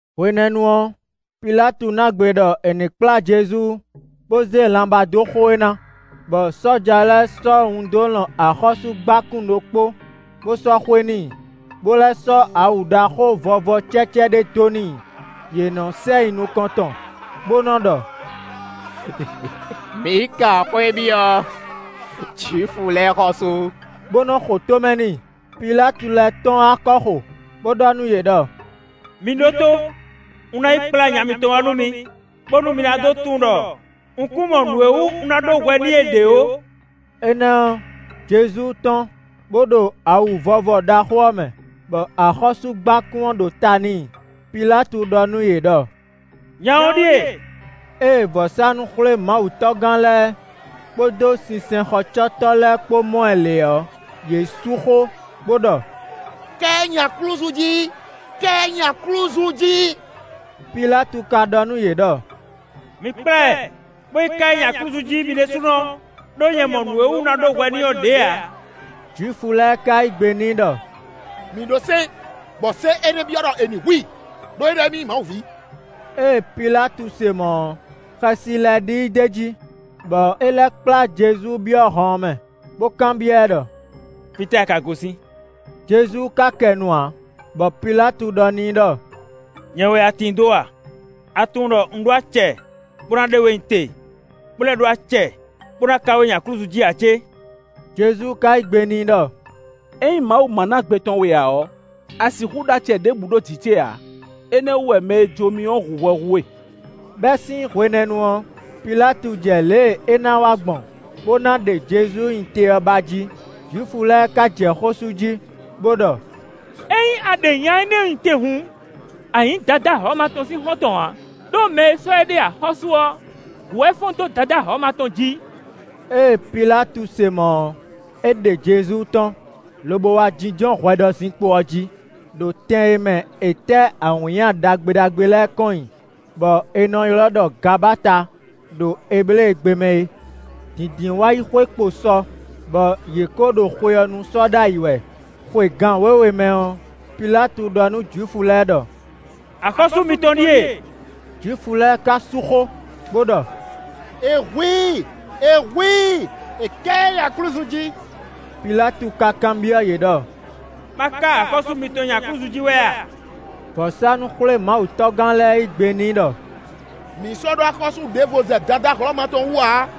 Hwenɛ́nu ɔ́, Pilátu ná gbe ɖɔ è ní kplá Jezu bó zé lanbá dó xo e ná; bɔ sɔ́ja lɛ́ɛ sɔ́ wun dó lɔn axɔ́súgbákún ɖokpó, bó sɔ́ xwe n'i, bó lɛ́ sɔ́ awu ɖaxó vɔvɔ cɛ́cɛ́ ɖé dó n'i. Yě nɔ sɛ yi nukɔn tɔn, bó nɔ ɖɔ: “Mǐ kan xwé byɔ́, Jwifu lɛ́ɛ xɔ́sú.” Bó nɔ́ xo tó mɛ n'i. Pilátu lɛ́ tɔ́n wá kɔ́xo, bó ɖɔ nú yě ɖɔ: “Mi ɖótó; un ná yi kplá nya mitɔn wá nú mi, bónú mi ná dó tunwun ɖɔ un kún mɔ nǔ e wú un ná ɖó hwɛ n'i é ɖě ó.” Énɛ́ ɔ́, Jezu tɔ́n, bó ɖo awu vɔvɔ ɖaxó ɔ́ mɛ, bɔ axɔ́súgbákún ɔ́ ɖo ta n'i. Pilátu ɖɔ nú yě ɖɔ: “Nya ɔ́ ɖíe.” Ée vɔ̌sánú-xwlémawutɔ́gán lɛ́ɛ kpódó sinsɛnxɔcɔ́tɔ́ lɛ́ɛ kpó mɔ ɛ lě ɔ́, yě sú xó, bó ɖɔ: “Ká ɛ nyi aklúzu jí! Ká ɛ nyi aklúzu jí!” Pilátu ka ɖɔ nú yě ɖɔ: “Mi kplá ɛ, bó yi ká ɛ nyi aklúzu jí mi ɖésúnɔ, ɖó nyɛ mɔ nǔ e wú un ná ɖó hwɛ n'i ɔ́ ɖě ǎ.” Jwifu lɛ́ɛ ka yí gbe n'i ɖɔ: “Mǐ ɖó sɛ́n, bɔ sɛ́n énɛ́ byɔ́ ɖɔ è ní hu i; ɖó é ɖɔ émí nyí Mawu ví.” Ée Pilátu se mɔ̌ ɔ́, xɛsi lɛ́ ɖi i d'é jí, bɔ é lɛ́ kplá Jezu byɔ́ hɔn ɔ́ mɛ, bó kanbyɔ́ ɛ ɖɔ: “Fítɛ́ a ka gosín?” Jezu ka kɛ nu ǎ, bɔ Pilátu ɖɔ n'i ɖɔ: “Nyɛ wɛ a tin dó a? A tunwun ɖɔ un ɖó acɛ bó ná ɖe we nyi te, bó lɛ́ ɖó acɛ bó ná ká we nyi aklúzu jí ǎ cé?” Jezu ka yí gbe n'i ɖɔ: “Ényí Mawu ma ná gbe tɔn we ǎ ɔ́, a sixú ɖó acɛ ɖěbǔ ɖo jǐ ce ǎ; énɛ́ ɔ́ wú wɛ mɛ e jó mì ɔ́ hu hwɛ hú we.” Bɛ́ sín hwenɛ́nu ɔ́, Pilátu jɛ lě e é ná wa gbɔn, bó ná ɖe Jezu nyi te ɔ́ ba jí. Jwifu lɛ́ɛ ka jɛ xó sú jí, bó ɖɔ: “Ényí a ɖe nya énɛ́ nyi te hǔn, a nyǐ Dadá Hlɔ̌ma tɔn sín xɔ́ntɔn ǎ; ɖó mɛ e sɔ́ éɖée axɔ́sú ɔ́, gǔ wɛ é fɔ́n dó Dadá Hlɔ̌ma tɔn jí.” Ée Pilátu se mɔ̌ ɔ́, é ɖe Jezu tɔ́n, lobo wá jínjɔ́n hwɛɖɔzinkpo ɔ́ jí, ɖo tɛn e mɛ è tɛ́ awǐnnya ɖagbe ɖagbe lɛ́ɛ kɔn nyi, bɔ è nɔ ylɔ́ ɖɔ “Gabata” ɖo Ebléegbe mɛ é. Dǐndínwáyixwe kpo sɔ, bɔ yě ko ɖo xwe ɔ́ nú sɔ́ ɖ'ayǐ wɛ, xwe gan wěwe mɛ ɔ́, Pilátu ɖɔ nú Jwifu lɛ́ɛ ɖɔ: “Axɔ́sú mitɔn ɖíe.” Jwifu lɛ́ɛ ka sú xó, bó ɖɔ: “È hu i! È hu i! È ká ɛ nyi aklúzu jí.” Pilátu ka kanbyɔ́ yě ɖɔ: “Má ká axɔ́sú mitɔn nyi aklúzu jí wɛ a?” Vɔ̌sánú-xwlémawutɔ́gán lɛ́ɛ yí gbe n'i ɖɔ: “Mǐ sɔ́ ɖó axɔ́sú ɖěvo zɛ Dadá Hlɔ̌ma tɔn wú ǎ.”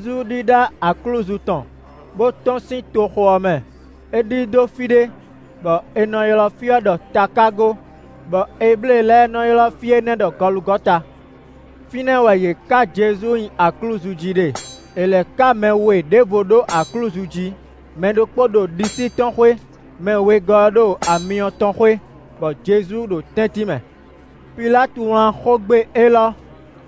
Jezu ɖíɖá aklúzu tɔn, bó tɔ́n sín toxo ɔ́ mɛ; é ɖidó fí ɖé, bɔ è nɔ ylɔ́ fí ɔ́ ɖɔ “takágo”, bɔ Eblée lɛ́ɛ nɔ́ ylɔ́ fí énɛ́ ɖɔ Gɔlugɔta. Fínɛ́ wɛ yě ká Jezu nyi aklúzu jí ɖe; è lɛ̌ ká mɛ we ɖěvo ɖó aklúzu jí; mɛ ɖokpó ɖo ɖisí tɔn xwé, mɛ wegɔ́ ɔ́ ɖo amyɔ tɔn xwé, bɔ Jezu ɖo tɛ́ntin mɛ. Pilátu wlán xógbe élɔ́,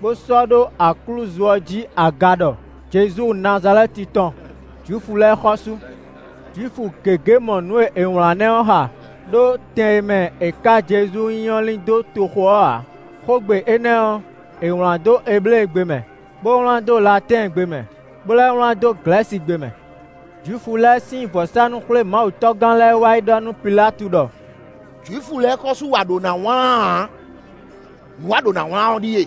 bó sɔ́ ɖó aklúzu ɔ́ jí aga ɖɔ: “Jezu Nazalɛ́ti tɔn, Jwifu lɛ́ɛ xɔ́sú.” Jwifu gěgé mɔ nǔ e è wlǎn énɛ́ ɔ́ xa, ɖó tɛn e mɛ è ká Jezu nyi ɔ́ lín dó toxo ɔ́ ǎ. Xógbe énɛ́ ɔ́, è wlǎn dó Ebléegbe mɛ, bó wlán dó Latɛ́ɛngbe mɛ, bó lɛ́ wlán dó Glɛ̌sigbe mɛ. Jwifu lɛ́ɛ sín vɔ̌sánú-xwlémawutɔ́gán lɛ́ɛ wá yi ɖɔ nú Pilátu ɖɔ: “Jwifu lɛ́ɛ xɔ́sú wɛ a ɖǒ ná wlán ǎ; nǔ e a ɖǒ ná wlán ɔ́ ɖíe: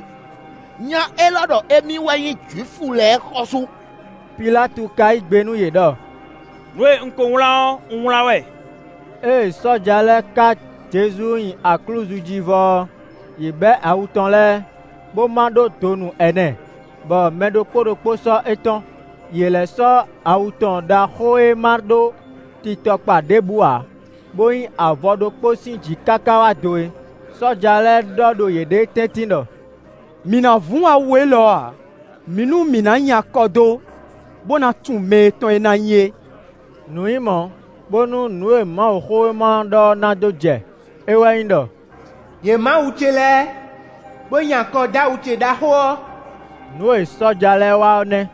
‘Nya élɔ́ ɖɔ émí wɛ nyí Jwifu lɛ́ɛ xɔ́sú.’” Pilátu ka yí gbe nú yě ɖɔ: “Nǔ e un ko wlán ɔ́, un wlán wɛ.” Ée sɔ́ja lɛ́ɛ ká Jezu nyi aklúzu jí vɔ ɔ́, yě bɛ́ awu tɔn lɛ́ɛ, bó má ɖó donu ɛnɛ, bɔ mɛ ɖokpó ɖokpó sɔ́ étɔn. Yě lɛ́ sɔ́ awu tɔn ɖaxó e má ɖó titɔkpa ɖěbǔ ǎ, bó nyí avɔ ɖokpó sín jǐ káká wá do é. Sɔ́ja lɛ́ɛ ɖɔ ɖo yěɖée tɛ́ntin ɖɔ: “Mǐ ná vún awu élɔ́ ǎ. Mi nú mǐ ná nyi akɔ dó, bó ná tunwun mɛ e tɔn é ná nyí é.” Nǔ nyí mɔ̌, bónú nǔ e Mawuxówéma ɔ́ ɖɔ ɔ́ ná dó jɛ. É wɛ nyí ɖɔ: “Yě má awu ce lɛ́ɛ, bó nyi akɔ dó awu ce ɖaxó ɔ́.” Nǔ e sɔ́ja lɛ́ɛ wa ɔ́ nɛ́.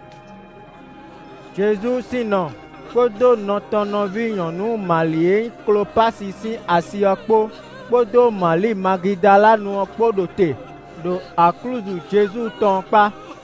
Jezu sín nɔ, kpódó nɔ tɔn nɔví nyɔ̌nu Mali e nyí Klopási sín asi ɔ́ kpó, kpódó Mali Magidalanu ɔ́ kpó ɖo te, ɖo aklúzu Jezu tɔn ɔ́ kpá.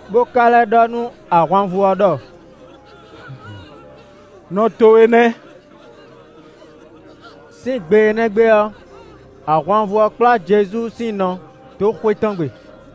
Bó ka lɛ́ ɖɔ nú ahwanvú ɔ́ ɖɔ: “Nɔ towe nɛ́!” Sín gbe énɛ́ gbe ɔ́, ahwanvú ɔ́ kplá Jezu sín nɔ dó xwé tɔn gbe.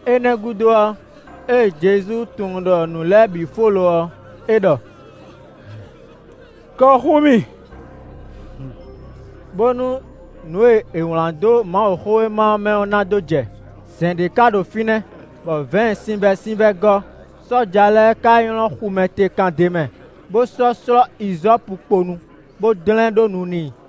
Énɛ́ gúdo ɔ́, ée Jezu tunwun ɖɔ nǔ lɛ́ɛ bǐ fó lo ɔ́, é ɖɔ: “Kɔ xú mì!” Bónú nǔ e è wlǎn dó Mawuxówéma ɔ́ mɛ ɔ́ ná dó jɛ. Zɛ̌n ɖé ka ɖo fínɛ́, bɔ vɛ̌ɛn sinvɛ́sinvɛ́ gɔ́, sɔ́ja lɛ́ɛ ka nylɔ́ xumɛtekan d'é mɛ, bó sɔ́ slɔ́ izɔ́pukpo nu, bó dlɛ́n ɖó nu n'i.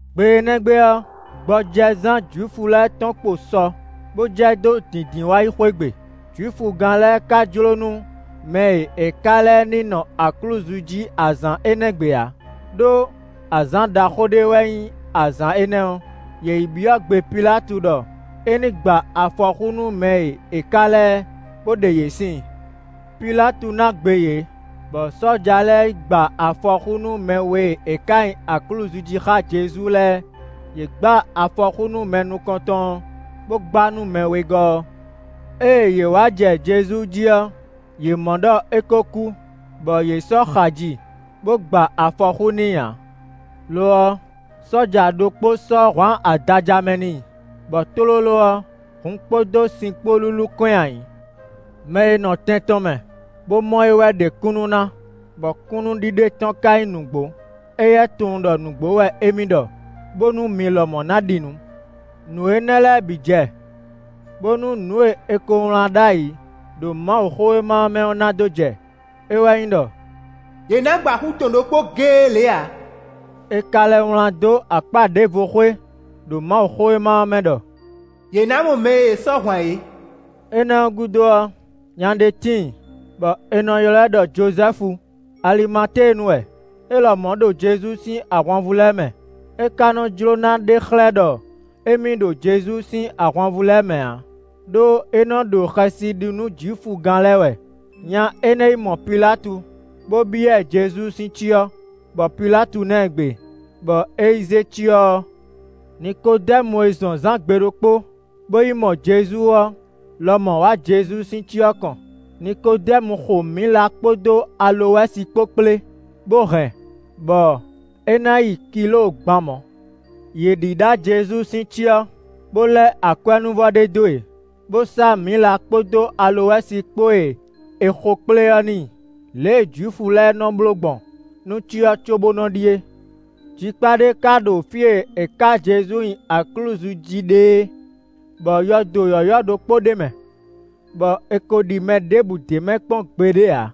Gbe énɛ́ gbe ɔ́, gbɔjɛzán Jwifu lɛ́ɛ tɔn kpo sɔ, bó jɛ dó Dǐndínwáyixwe gbe. Jwifugán lɛ́ɛ ka jló nú mɛ e è ká lɛ́ɛ ní nɔ aklúzu jí azǎn énɛ́ gbe ǎ, ɖó azǎn ɖaxó ɖé wɛ nyí azǎn énɛ́ ɔ́. Yě yi byɔ́ gbe Pilátu ɖɔ é ní gba afɔxú nú mɛ e è ká lɛ́ɛ, bó ɖe yě síin. Pilátu ná gbe yě, bɔ sɔ́ja lɛ́ɛ yi gba afɔxú nú mɛ we e è ká nyi aklúzu jí xá Jezu lɛ́ɛ; yě gba afɔxú nú mɛ nukɔn tɔn ɔ́, bó gba nú mɛ wegɔ́ ɔ́. Ée yě wá jɛ Jezu jí ɔ́, yě mɔ ɖɔ é ko kú, bɔ yě sɔ́ xaji bó gba afɔxú n'i ǎ. Lo ɔ́, sɔ́ja ɖokpó sɔ́ hwǎn adaja mɛ n'i, bɔ tlóló ɔ́, hun kpódó sin kpó lúlú kɔn nyi ayǐ. Mɛ e nɔ tɛn tɔn mɛ, bó mɔ é wɛ ɖe kúnnu ná, bɔ kúnnuɖiɖe tɔn ka nyí nǔgbó. Éyɛ́ tunwun ɖɔ nǔgbó wɛ émí ɖɔ, bónú mi lɔmɔ̌ ná ɖi nǔ. Nǔ énɛ́ lɛ́ɛ bǐ jɛ, bónú nǔ e è ko wlán ɖ'ayǐ ɖo Mawuxówéma ɔ́ mɛ ɔ́ ná dó jɛ; é wɛ nyí ɖɔ: “È nǎ gba xú tɔn ɖokpó géé lě ǎ.” È ka lɛ́ wlán dó akpá ɖěvo xwé ɖo Mawuxówéma ɔ́ mɛ ɖɔ: “Yě ná mɔ mɛ e yě sɔ́ hwǎn é.” Énɛ́ ɔ́ gúdo ɔ́, nya ɖé tíin, bɔ è nɔ ylɔ́ ɛ ɖɔ Jozɛ́fu; Alimatéenu wɛ; é lɔmɔ̌ ɖo Jezu sín ahwanvú lɛ́ɛ mɛ. É ka nɔ jló ná ɖe xlɛ́ ɖɔ émí ɖo Jezu sín ahwanvú lɛ́ɛ mɛ ǎ; ɖó é nɔ ɖo xɛsi ɖi nú Jwifugán lɛ́ɛ wɛ. Nya énɛ́ yi mɔ Pilátu, bó byɔ́ ɛ Jezu sín cyɔ, bɔ Pilátu ná ɛ gbe, bɔ é yi zé cyɔ ɔ́. Nikodɛ́mu e zɔn zǎn gbe ɖokpó, bó yi mɔ Jezu ɔ́ lɔmɔ̌ wá Jezu sín cyɔ kɔn. Nikodɛ́mu xo mǐla kpódó alowɛ́si kpó kplé, bó hɛn, bɔ é ná yi kilóo gban mɔ̌. Yě ɖíɖá Jezu sín cyɔ, bo lɛ́ akwɛ́núvɔ ɖé dó e, bo sá mǐla kpódó alowɛ́si kpó e è xokplé ɔ́ n'i, lě e Jwifu lɛ́ɛ nɔ bló gbɔn nú cyɔ cóbó nɔ ɖi é. Jikpá ɖé ka ɖo fí e è ká Jezu nyi aklúzu jí ɖe é, bɔ yɔdo yɔ̌yɔ́ ɖokpó ɖ'é mɛ, bɔ è ko ɖi mɛ ɖěbǔ d'é mɛ kpɔ́n gbeɖé ǎ.